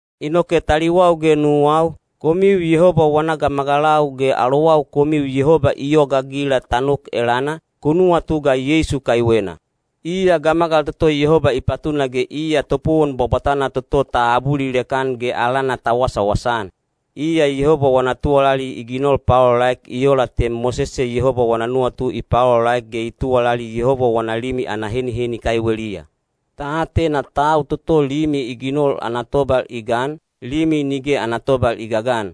Inoke taliwau ge nuwau, komiu Yehoba wana gamagalau ge alowau komiu Yehoba i yogaagila ta nok elana, ku nuwatu ga Yeisu kaiwena. Iya gamagal toto Yehoba i patuna ge iya topowon bwabwatana toto ta abulilek-an ge alana ta wasawasa-an. Iya Yehoba wana tuwalali i ginol paolaolaek i ola te Mosese Yehoba wana nuwatu i paolaolaek ge i tuwalali Yehoba wana limi ana heniheni kaiweliya. Ta atena tau toto limi i ginol ana tobal i gan, limi nige ana tobal i gagan.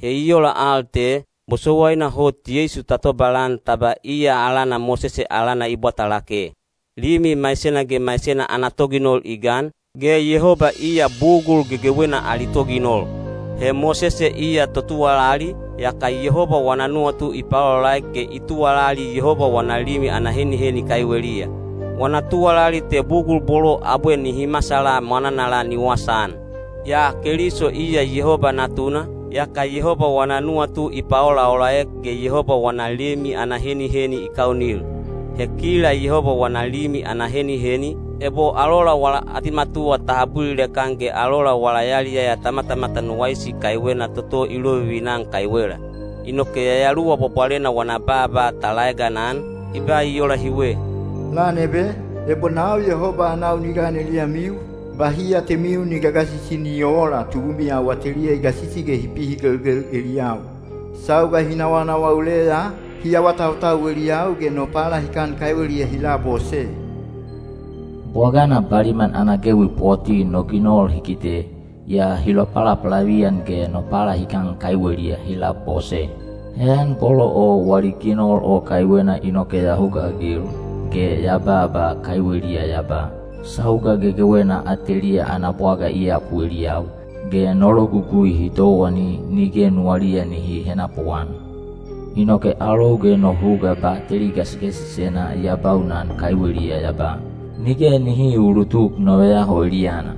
He i ola al te, bosowaina hot Yeisu ta tobalan ta ba iya alana Mosese alana i bwata lake. Limi maisena ge maisena ana toginol i gan, ge Yehoba iya bugul gegewena ali toginol. He Mosese iya totuwalali, yaka Yehoba wana nuwatu i paolaolaek ge i tuwalali Yehoba wana limi ana heniheni kaiweliya. Wana tuwalali te bugul bolo abwe nihi masala mwananala ni wasaan. Yaa Keliso iya Yehoba Natuna, yaka Yehoba wana nuwatu i paolaolaek ge Yehoba wana limi ana heniheni i kaunil. He kila Yehoba wana limi ana heniheni, ebo alola wala atimatuwa ta abulilek-an ge alola wala yaliyaya ta matamatan waisi kaiwena toto i lovivina-an kaiwela. Inoke Yayaluwa Bwabwalena wana baaba ta laeganan, i ba i ola hiwe: Lan ebe, ebo nau Yehoba anau ni gan eliyamiu, bahi atemiu ni gagasisi ni oola tubumiyau ateliya i gasisi ge hi pihigelgel eliyau. Sauga hi nawanawa uleya, hi awatautau eliyau ge no palahikan kaiweliya hi labose. Bwagana baliman ana gewi poti no ginol hi kite, yaa hi lopalapalaviyan ge no palahikan kaiweliya hi labose. Heyan bolo o wali ginol o kaiwena inoke ya hugaagil, ge ya baaba kaiweliya ya ba, “Sauga gegewena ateliya ana bwaga i yapu eliyau, ge no logugui hi towani nige nuwaliya nihi henapuan.” Inoke alou ge no huga bateli gasigasisena ya baunan kaiweliya ya ba, “Nige nihi uulutuk no veyaho eliyana.”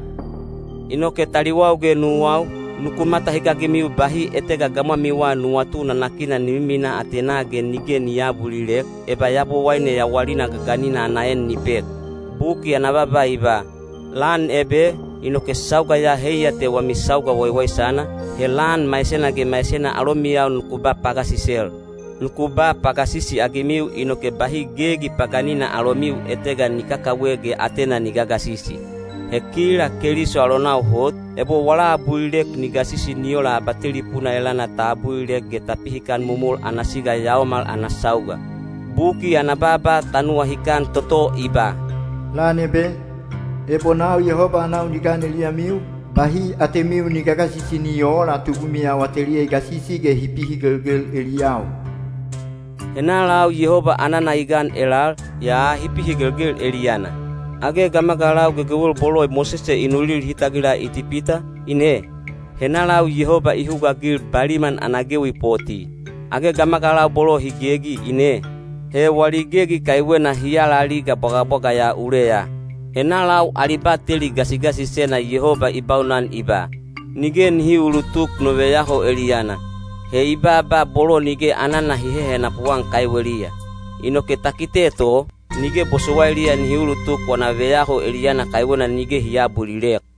Inoke taliwau ge nuwau, nuku matahikagimiu bahi etega gamwamiwa nuwatu nanakina ni miminaa atenaa ge nige ni aabulilek, eba Yabowaine yawalina gaganina ana en ni pek. Buki ana baaba i ba, “Lan ebe,” inoke sauga ya heiya te wami sauga waiwaisana, he lan maisena ge maisena alomiyau nuku ba pagasisel. Nuku ba pagasisi-agimiu inoke bahi gegi paganina alomiu etega ni kakawe ge atena ni gagasisi. He kila Keliso alonau hot, ebo wala abulilek ni gasisi ni ola abatelipuna elana ta abulilek ge ta pihikan momol ana siga yaomal ana sauga. Buki ana baaba ta nuwahikan toto i ba: Lan ebe, ebo nau Yehoba anau ni gan eliyamiu, bahi atemiu ni gagasisi ni oola tubumiyau ateliya i gasisi ge hi pihigelgel eliyau. Henalau Yehoba anana i gan elal, yaa hi pihigelgel eliyana? Age gamagalau gegewel bolo Mosese i nulil hi tagila Itipita, ine? Henalau Yehoba i hugaagil baliman ana gewi poti? Age gamagalau bolo hi gegi, ine? He wali gegi kaiwena hi alaliga bwagabwaga ya uleya. Henalau ali bateli gasigasisena Yehoba i baunan i ba, “Nige nihi uulutuk no veyaho eliyana?” He i baaba bolo nige anana hi hehenapu-an kaiweliya. Inoke ta kite to, nige bosowailiya nihi ulutuk wana veyaho eliyana kaiwena nige hi aabulilek.